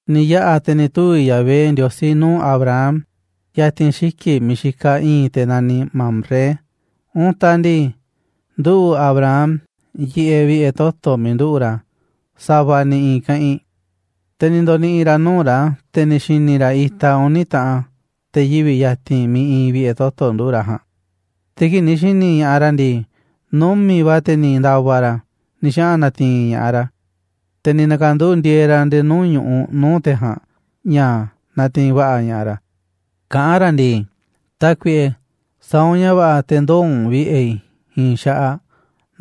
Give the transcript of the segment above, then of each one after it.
Ni̱ yaꞌa̱ te̱ ni̱ tuvi̱ Yahvé Ndiosí nuu̱ꞌ Abraham ya̱ti̱n xiki̱ꞌ miiꞌ xikaꞌ i̱i̱n te̱ naniꞌ Mamré. Untaꞌ ndii, nduꞌu̱ꞌ Abraham yiꞌeꞌ vi̱ꞌe̱ toto̱ miiꞌ nduꞌu̱ꞌ ra̱, sa̱va̱ ni̱ i̱i̱n keꞌinꞌ. Te̱ ni̱ ndo̱ni̱ꞌi̱ ra̱ nuu̱ꞌ ra̱, te̱ ni̱ xi̱ni̱ ra̱ itaꞌ uni̱ taꞌan te̱ yivi̱ꞌ ya̱ti̱n miiꞌ iinꞌ vi̱ꞌe̱ toto̱ nduꞌu̱ꞌ ra̱ ja̱a̱nꞌ. Te̱ kii̱ꞌ ni̱ xi̱ni̱ ña̱ꞌaꞌ ra̱ ndii, numi̱ꞌ va̱ te̱ ni̱ nda̱va̱ ra̱ ni̱ xaꞌa̱n na̱ti̱i̱n ña̱ꞌaꞌ ra̱, te̱ ni̱ na̱ka̱nduꞌu̱ꞌ ndi̱e̱e̱ ra̱ nde̱e̱ nuu̱ꞌ ñu̱ꞌuꞌ nuu̱ꞌ te̱ ja̱a̱nꞌ, ña̱ natiinꞌ va̱ꞌa̱ ña̱ꞌaꞌ ra̱, kaꞌán ra̱ ndii: ―Tákuiꞌe, sa̱a̱ u̱nꞌ ña̱ va̱ꞌa̱, te̱ ndoo̱ u̱nꞌ vi̱ꞌe̱ i̱ i̱i̱n xaꞌaꞌ,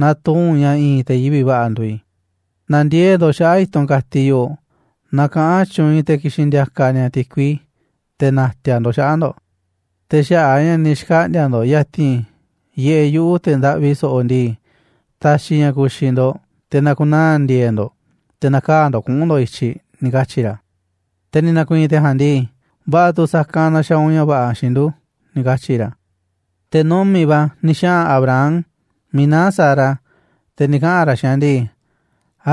naaꞌ tuu u̱nꞌ ña̱ i̱i̱n te̱ yivi̱ꞌ va̱ꞌa̱ nduuꞌ i̱. Na̱ndiee̱ꞌ ndo̱ꞌ xaꞌa̱ꞌ i̱tunꞌ ka̱tiꞌ yoꞌoꞌ, na kaꞌa̱n tyuunꞌ i̱ te̱ ki̱xi̱n ndi̱a̱ka̱ ni̱a̱ ti̱kui te̱ na̱ti̱a̱ ndo̱ꞌ xaꞌa̱ꞌ ndo̱ꞌ. Te̱ xaꞌa̱ꞌ a̱ ña̱ ni̱ xkaꞌndi̱a̱ ndo̱ꞌ ya̱ti̱n vi̱ꞌe̱ yuꞌu̱, te̱ ndaꞌvi so̱ꞌo̱ ndii, ta̱xi̱ i̱ ña̱ ku̱xi̱ ndo̱ꞌ, te̱ na̱ku̱naa̱ ndi̱e̱e̱ꞌ ndo̱ꞌ, te̱ na̱kaa̱ ndo̱ꞌ kuꞌu̱n ndo̱ꞌ i̱tyiꞌ ―ni̱ katyi̱ ra̱. Te̱ ni̱ na̱ku̱i̱i̱n te̱ ja̱a̱nꞌ ndii: ―Va̱ꞌa̱ tu̱ sa̱kanꞌ naaꞌ xaaꞌ u̱nꞌ ña̱ va̱ꞌa̱ xiinꞌ ndu̱ ―ni̱ katyi̱ ra̱. Te̱ numi̱ꞌ va̱ ni̱ xaꞌa̱n Abraham miiꞌ naá Sara, te̱ ni̱ kaꞌa̱n ra̱ xiinꞌ aꞌ ndii: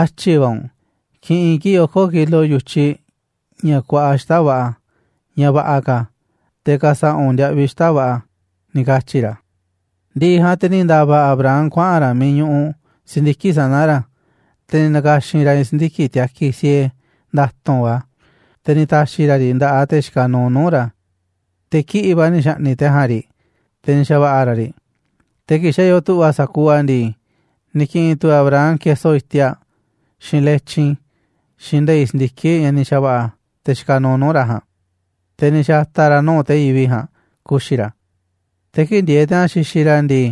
―Átyi̱ va̱ u̱nꞌ, ki̱ꞌi̱n kii̱ꞌ oko̱ kilo yu̱tyiꞌ, ña̱ kuaꞌa xita̱ꞌ va̱ꞌa̱, ña̱ va̱ꞌa̱ ka̱, te̱ ka̱sa̱ꞌa̱ u̱nꞌ ndiaꞌviꞌ xita̱ꞌ va̱ꞌa̱ ―ni̱ katyi̱ ra̱. Ndi̱ꞌi̱ ja̱a̱nꞌ te̱ ni̱ nda̱va̱ Abraham kuaꞌa̱n ra̱ miiꞌ ñuꞌuꞌ si̱ndiki̱ꞌ sana̱ ra̱, te̱ ni̱ na̱ka̱xi̱n ra̱ i̱i̱n si̱ndiki̱ꞌ tiakiꞌ siee nda̱tu̱nꞌ va̱, te̱ ni̱ ta̱xi̱ ra̱ riꞌ nda̱ꞌaꞌ te̱ xikaꞌ nuuꞌ nuu̱ꞌ ra̱, te̱ kiꞌi̱ꞌ va̱ ni̱ xa̱ꞌni̱ꞌ te̱ ja̱a̱nꞌ riꞌ, te̱ ni̱ xa̱va̱ꞌa̱ ra̱ riꞌ. Te̱ kii̱ꞌ xa̱ yoo tu̱ꞌva̱ sa̱kuuꞌ a̱ ndii, ni̱ ki̱ꞌi̱n tu̱ Abraham keso iti̱a̱ꞌ, xiinꞌ letyin, xiinꞌ nde̱i̱ꞌ si̱ndiki̱ꞌ, ña̱ ni̱ xa̱va̱ꞌa̱ te̱ xikaꞌ nuuꞌ nuu̱ꞌ ra̱ ja̱a̱nꞌ, te̱ ni̱ xa̱ta̱ ra̱ a̱ nuu̱ꞌ te̱ yivi̱ꞌ ja̱a̱nꞌ ku̱xi̱ ra̱. Te̱ kii̱ꞌ ndieeꞌ te̱ ja̱a̱nꞌ xixiꞌ ra̱ ndii,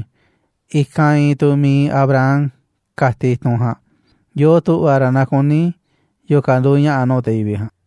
i̱kanꞌ iinꞌ tu̱ mi̱iꞌ Abraham ka̱tiꞌ i̱tunꞌ ja̱a̱nꞌ, yoo tu̱ꞌva̱ ra̱ naaꞌ kuní yo̱o̱ ka̱ nduuꞌ ña̱ꞌa̱ nuu̱ꞌ te̱ yivi̱ꞌ ja̱a̱nꞌ.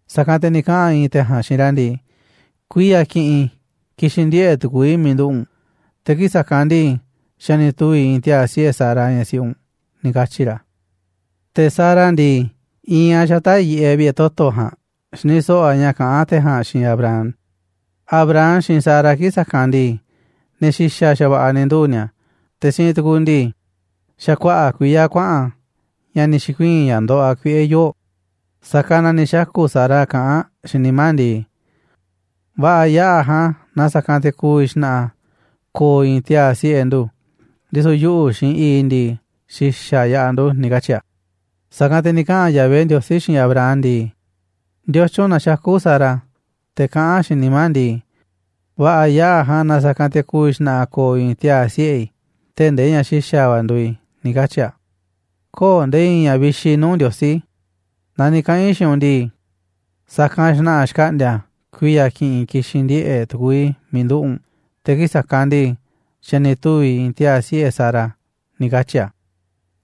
Sa̱kanꞌ te̱ ni̱ kaꞌa̱n i̱i̱n te̱ ja̱a̱nꞌ xiinꞌ ra̱ ndii: ―Kuiya̱ ki̱ꞌi̱n ki̱xi̱n ndiꞌe̱ꞌ tu̱ku̱u̱ i̱ miiꞌ nduꞌu̱ꞌ u̱nꞌ, te̱ kii̱ꞌ sa̱kanꞌ ndii, xa̱ ni̱ tuvi̱ i̱i̱n tiaa̱ siꞌe̱ Sara, ñaꞌ siꞌi u̱nꞌ ―ni̱ katyi̱ ra̱. Te̱ Sara ndii, iinꞌ aꞌ xata̱ꞌ yiꞌeꞌ vi̱ꞌe̱ toto̱ ja̱a̱nꞌ xini so̱ꞌo̱ aꞌ ña̱ kaꞌán te̱ ja̱a̱nꞌ xiinꞌ Abraham. Abraham, xiinꞌ Sara kii̱ꞌ sa̱kanꞌ ndii, ne̱ xi̱xa̱ xa̱va̱ꞌa̱ ni̱ nduu̱ꞌ ni̱a̱, te̱ siinꞌ tu̱ku̱ ndii, xa̱ kuaꞌa̱ꞌ kuiya̱ kuaꞌa̱n ña̱ ni̱ xi̱kuii̱n ña̱ ndoꞌoꞌ aꞌ kuiꞌe̱ yoo̱ꞌ. Sa̱kanꞌ na ni̱ xaku̱ Sara kaꞌán aꞌ xiinꞌ nimá aꞌ ndii: "Va̱ꞌa̱ yaꞌa̱ ja̱a̱nꞌ na sa̱kanꞌ te̱ ku̱vi̱ xna̱ꞌa̱ ko̱o̱ i̱i̱n tiaa̱ siꞌe̱ ndu̱, ndisu̱ yuꞌu̱ xiinꞌ i̱i̱ꞌ i̱ ndii, xi̱xa̱ yaꞌa̱ ndu̱", ni̱ katyi̱ aꞌ. Sa̱kanꞌ te̱ ni̱ kaꞌa̱n Yahvé Ndiosí xiinꞌ Abraham ndii: ―¿Ndiotyun na xakú Sara, te̱ kaꞌán aꞌ xiinꞌ nimá aꞌ ndii: “Va̱ꞌa̱ yaꞌa̱ ja̱a̱nꞌ na sa̱kanꞌ te̱ ku̱vi̱ xna̱ꞌa̱ ko̱o̱ i̱i̱n tiaa̱ siꞌe̱ i̱ tee̱ꞌ ndee ñaꞌ xi̱xa̱ va̱ nduuꞌ i̱”, ni̱ katyi̱ aꞌ? Köo̱ꞌ nde̱e̱ i̱i̱n ña̱ vixi nuu̱ꞌ Ndiosí. Naa ni̱ kaꞌa̱n i̱ xiinꞌ u̱nꞌ ndii, sa̱kanꞌ xna̱ꞌa̱ xkaꞌndi̱a̱ a̱ kuiya̱ ki̱ꞌi̱n ki̱xi̱n ndiꞌe̱ꞌ tu̱ku̱u̱ i̱ miiꞌ nduꞌu̱ꞌ u̱nꞌ, te̱ kii̱ꞌ sa̱kanꞌ ndii, xa̱ ni̱ tuvi̱ i̱i̱n tiaa̱ siꞌe̱ Sara ―ni̱ katyi̱ a̱.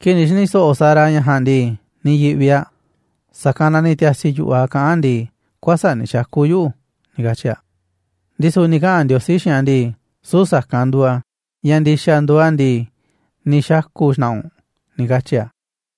Kii̱ꞌ ni̱ xi̱ni̱ so̱ꞌo̱ Sara ña̱ ja̱a̱nꞌ ndii, ni̱ yi̱ꞌvi aꞌ, sa̱kanꞌ na ni̱ ti̱a̱si̱ yu̱ꞌuꞌ aꞌ kaꞌán aꞌ ndii: ―Kuäsa̱ꞌ ni̱ xaku̱ yuꞌu̱ ―ni̱ katyi̱ aꞌ. Ndisu̱ ni̱ kaꞌa̱n Ndiosí xiinꞌ aꞌ ndii: ―Süu̱ꞌ sa̱kanꞌ nduuꞌ a̱, ña̱ ndi̱xa̱ nduuꞌ a̱ ndii, ni̱ xaku̱ xna̱ꞌa̱ u̱nꞌ ―ni̱ katyi̱ a̱.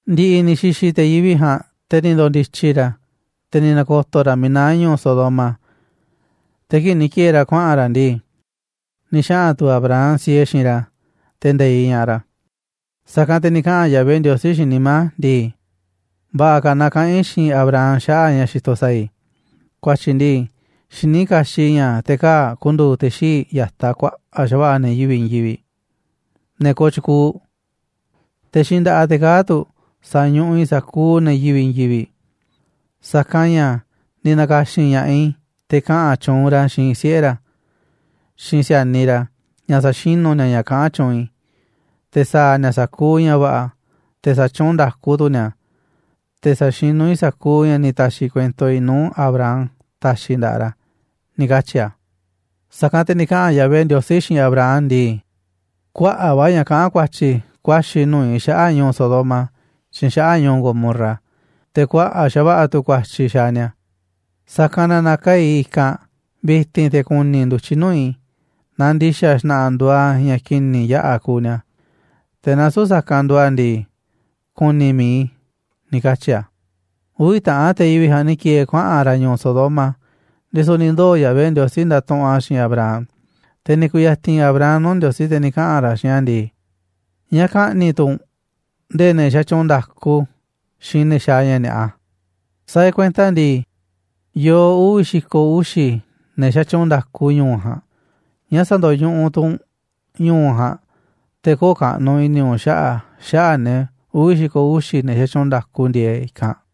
Ndi̱ꞌi̱ ni̱ xi̱xi̱ te̱ yivi̱ꞌ ja̱a̱nꞌ, te̱ ni̱ ndo̱ndi̱tyi̱ ra̱, te̱ ni̱ na̱ko̱to̱ ra̱ miiꞌ naá ñu̱u̱ Sodoma. Te̱ kii̱ꞌ ni̱ ki̱e̱e̱ ra̱ kuaꞌa̱n ra̱ ndii, ni̱ xaꞌa̱n tu̱ Abraham siee xiinꞌ ra̱, te̱ nde̱iꞌ ña̱ꞌaꞌ ra̱. Sa̱kanꞌ te̱ ni̱ kaꞌa̱n Yahvé Ndiosí xiinꞌ nimá a̱ ndii: «Va̱ꞌa̱ ka̱ naaꞌ kaꞌa̱n i̱ xiinꞌ Abraham xaꞌa̱ꞌ ña̱ xitoꞌ sa̱a̱ i̱. Ku̱a̱tyi̱ ndii, xiní kaxiꞌ i̱ ña̱ te̱ kaa̱ꞌ ku̱ndu̱u̱ te̱ xii̱ꞌ ya̱taꞌ kuaꞌa̱ꞌ xa̱va̱ꞌa̱ ne̱ yivi̱ꞌ i̱i̱n yivi̱ꞌ, ne̱ kooꞌ tyukuuꞌ, te̱ xiinꞌ nda̱ꞌaꞌ te̱ kaa̱ꞌ tu̱ sa̱ñuꞌuꞌ i̱ sa̱kuuꞌ ne̱ yivi̱ꞌ i̱i̱n yivi̱ꞌ. Sa̱kanꞌ ña̱ ni̱ na̱ka̱xi̱n ña̱ꞌaꞌ i̱ te̱ kaꞌa̱n tyuunꞌ ra̱ xiinꞌ siꞌe̱ ra̱, xiinꞌ si̱a̱niꞌ ra̱, ña̱ sa̱xinu̱ ni̱a̱ ña̱ kaꞌán tyuunꞌ i̱, te̱ sa̱a̱ ni̱a̱ sa̱kuuꞌ ña̱ va̱ꞌa̱, te̱ sa̱tyuunꞌ nda̱ku tu̱ ni̱a̱, te̱ sa̱xinú i̱ sa̱kuuꞌ ña̱ ni̱ ta̱xi̱ kuento i̱ nuu̱ꞌ Abraham ta̱xi̱ i̱ nda̱ꞌaꞌ ra̱», ni̱ katyi̱ a̱. Sa̱kanꞌ te̱ ni̱ kaꞌa̱n Yahvé Ndiosí xiinꞌ Abraham ndii: ―Kuaꞌa̱ꞌ va̱ ña̱ kaꞌán ku̱a̱tyi̱ ku̱a̱xi̱ nuu̱ꞌ i̱ xaꞌa̱ꞌ ñu̱u̱ Sodoma xiinꞌ xaꞌa̱ꞌ ñu̱u̱ Gomorra, te̱ kuaꞌa̱ꞌ xa̱va̱ꞌa̱ tu̱ ku̱a̱tyi̱ xaaꞌ ni̱a̱. Sa̱kanꞌ na, na̱kaa̱ꞌ i̱ i̱kanꞌ vi̱ti̱n te̱ ku̱ni̱ i̱ ndu̱tyiꞌ nuu̱ꞌ i̱ naaꞌ ndi̱xa̱ xna̱ꞌa̱ nduuꞌ a̱ ña̱ ki̱ni̱ yaꞌa̱ kuuꞌ ni̱a̱. Te̱ naaꞌ süu̱ꞌ sa̱kanꞌ nduuꞌ a̱ ndii, ku̱ni̱ mi̱iꞌ i̱ ―ni̱ katyi̱ a̱. Uvi̱ taꞌan te̱ yivi̱ꞌ ja̱a̱nꞌ ni̱ ki̱e̱e̱ kuaꞌa̱n ra̱ ñu̱u̱ Sodoma, ndisu̱ ni̱ ndoo̱ Yahvé Ndiosí ndatuꞌunꞌ a̱ xiinꞌ Abraham. Te̱ ni̱ ku̱ya̱ti̱n Abraham nuu̱ꞌ Ndiosí, te̱ ni̱ kaꞌa̱n ra̱ xiinꞌ a̱ ndii: ―¿Ñáá ka̱ꞌni̱ꞌ tu̱ u̱nꞌ nde̱e̱ ne̱ xatyuunꞌ nda̱ku xiinꞌ ne̱ xaaꞌ ña̱ ni̱a̱ꞌa? Sa̱a̱ e̱ꞌ kuenta ndii, yoo uvi̱ xi̱ko̱ uxi̱ ne̱ xatyuunꞌ nda̱ku ñu̱u̱ ja̱a̱nꞌ. ¿Ñáá sa̱ndo̱ñuꞌuꞌ tu̱ u̱nꞌ ñu̱u̱ ja̱a̱nꞌ, te̱ köo̱ꞌ kaꞌnuꞌ i̱ni̱ u̱nꞌ xaꞌa̱ꞌ a̱, xaꞌa̱ꞌ ne̱ uvi̱ xi̱ko̱ uxi̱, ne̱ xatyuunꞌ nda̱ku ndieeꞌ i̱kanꞌ?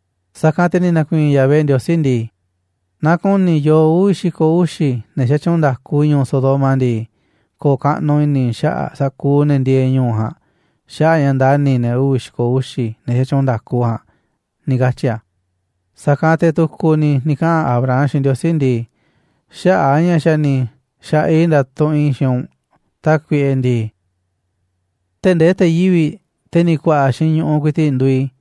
Sa̱kanꞌ te̱ ni̱ na̱ku̱i̱i̱n Yahvé Ndiosí ndii: ―Naaꞌ ku̱ni̱ i̱ yoo uvi̱ xi̱ko̱ uxi̱ ne̱ xatyuunꞌ nda̱ku ñu̱u̱ Sodoma ndii, ko̱o̱ kaꞌnuꞌ i̱ni̱ i̱ xaꞌa̱ꞌ sa̱kuuꞌ ne̱ ndieeꞌ ñu̱u̱ ja̱a̱nꞌ, xaꞌa̱ꞌ a̱ ña̱ ndani̱ i̱ ne̱ uvi̱ xi̱ko̱ uxi̱ ne̱ xatyuunꞌ nda̱ku ja̱a̱nꞌ ―ni̱ katyi̱ a̱. Sa̱kanꞌ te̱ tu̱ku̱ ni̱ ni̱ kaꞌa̱n Abraham xiinꞌ Ndiosí ndii: ―Xaꞌa̱ꞌ a̱ ña̱ xa̱ ni̱ xa̱ꞌaꞌ i̱ ndatuꞌunꞌ i̱ xiinꞌ u̱nꞌ, Tákuiꞌe ndii, tee̱ꞌ nde̱e̱ te̱ yivi̱ꞌ, te̱ ni̱ ku̱a̱ꞌa̱ xiinꞌ ñu̱ꞌuꞌ ku̱i̱ti̱ꞌ, nduuꞌ i̱,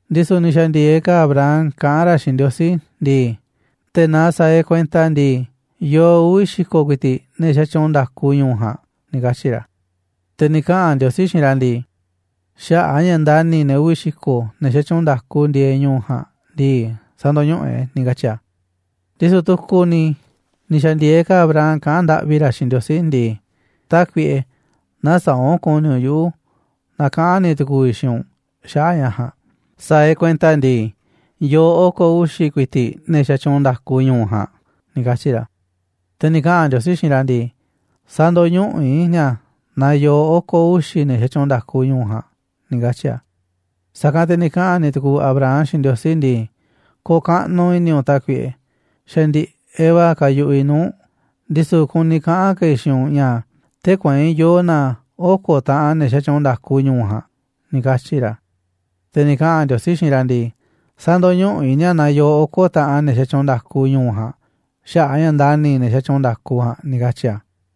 Ndisu̱ ni̱ xa̱ndi̱e̱eꞌ ka̱ Abraham kaꞌán ra̱ xiinꞌ Ndiosí ndii: ―Te̱ naaꞌ sa̱a̱ e̱ꞌ kuenta ndii, yoo uvi̱ xi̱ko̱ ku̱i̱ti̱ꞌ ne̱ xatyuunꞌ nda̱ku ñu̱u̱ ja̱a̱nꞌ ―ni̱ katyi̱ ra̱. Te̱ ni̱ kaꞌa̱n Ndiosí xiinꞌ ra̱ ndii: ―Xaꞌa̱ꞌ a̱ ña̱ ndani̱ i̱ ne̱ uvi̱ xi̱ko̱, ne̱ xatyuunꞌ nda̱ku ndieeꞌ ñu̱u̱ ja̱a̱nꞌ ndii, sä̱ndo̱ñuꞌuꞌ e̱ꞌ a̱ ―ni̱ katyi̱ a̱. Ndisu̱ tu̱ku̱ ni̱ ni̱ xa̱ndi̱e̱eꞌ ka̱ Abraham kaꞌán ndaꞌvi ra̱ xiinꞌ Ndiosí ndii: ―Tákuiꞌe, nä̱saa̱ꞌ u̱nꞌ ku̱ni̱ u̱nꞌ yuꞌu̱ naaꞌ kaꞌa̱n ni̱ tu̱ku̱u̱ i̱ xiinꞌ u̱nꞌ xaꞌa̱ꞌ ña̱ ja̱a̱nꞌ. Sa̱a̱ e̱ꞌ kuenta ndii, yoo oko̱ uxi̱ ku̱i̱ti̱ꞌ ne̱ xatyuunꞌ nda̱ku ñu̱u̱ ja̱a̱nꞌ ―ni̱ katyi̱ ra̱. Te̱ ni̱ kaꞌa̱n Ndiosí xiinꞌ ra̱ ndii: ―Sä̱ndo̱ñuꞌuꞌ i̱ ni̱a̱ naaꞌ yoo oko̱ uxi̱ ne̱ xatyuunꞌ nda̱ku ñu̱u̱ ja̱a̱nꞌ ―ni̱ katyi̱ a̱. Sa̱kanꞌ te̱ ni̱ kaꞌa̱n ni̱ tu̱ku̱u̱ Abraham xiinꞌ Ndiosí ndii: ―Ko̱o̱ kaꞌnuꞌ i̱ni̱ u̱nꞌ, Tákuiꞌe, xa̱ ndiꞌe̱ꞌ va̱ kayuꞌuꞌ i̱ nuu̱ꞌ u̱nꞌ, ndisu̱ kuni kaꞌa̱n ka̱ i̱ xiinꞌ u̱nꞌ ña̱, tee̱ꞌ kueinꞌ yoo na oko̱ taꞌan ne̱ xatyuunꞌ nda̱ku ñu̱u̱ ja̱a̱nꞌ ―ni̱ katyi̱ ra̱. Te̱ ni̱ kaꞌa̱n Ndiosí xiinꞌ ra̱ ndii: ―Sä̱ndo̱ñuꞌuꞌ i̱ ni̱a̱ naaꞌ yoo oko̱ taꞌan ne̱ xatyuunꞌ nda̱ku ñu̱u̱ ja̱a̱nꞌ, xaꞌa̱ꞌ a̱ ña̱ ndani̱ i̱ ne̱ xatyuunꞌ nda̱ku ja̱a̱nꞌ ―ni̱ katyi̱ a̱.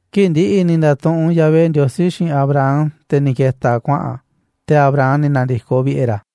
Kii̱ꞌ ndi̱ꞌi̱ ni̱ nda̱tuꞌunꞌ Yahvé Ndiosí xiinꞌ Abraham, te̱ ni̱ ke̱ta̱ a̱ kuaꞌa̱n a̱, te̱ Abraham ni̱ na̱ndi̱koꞌ vi̱ꞌe̱ ra̱.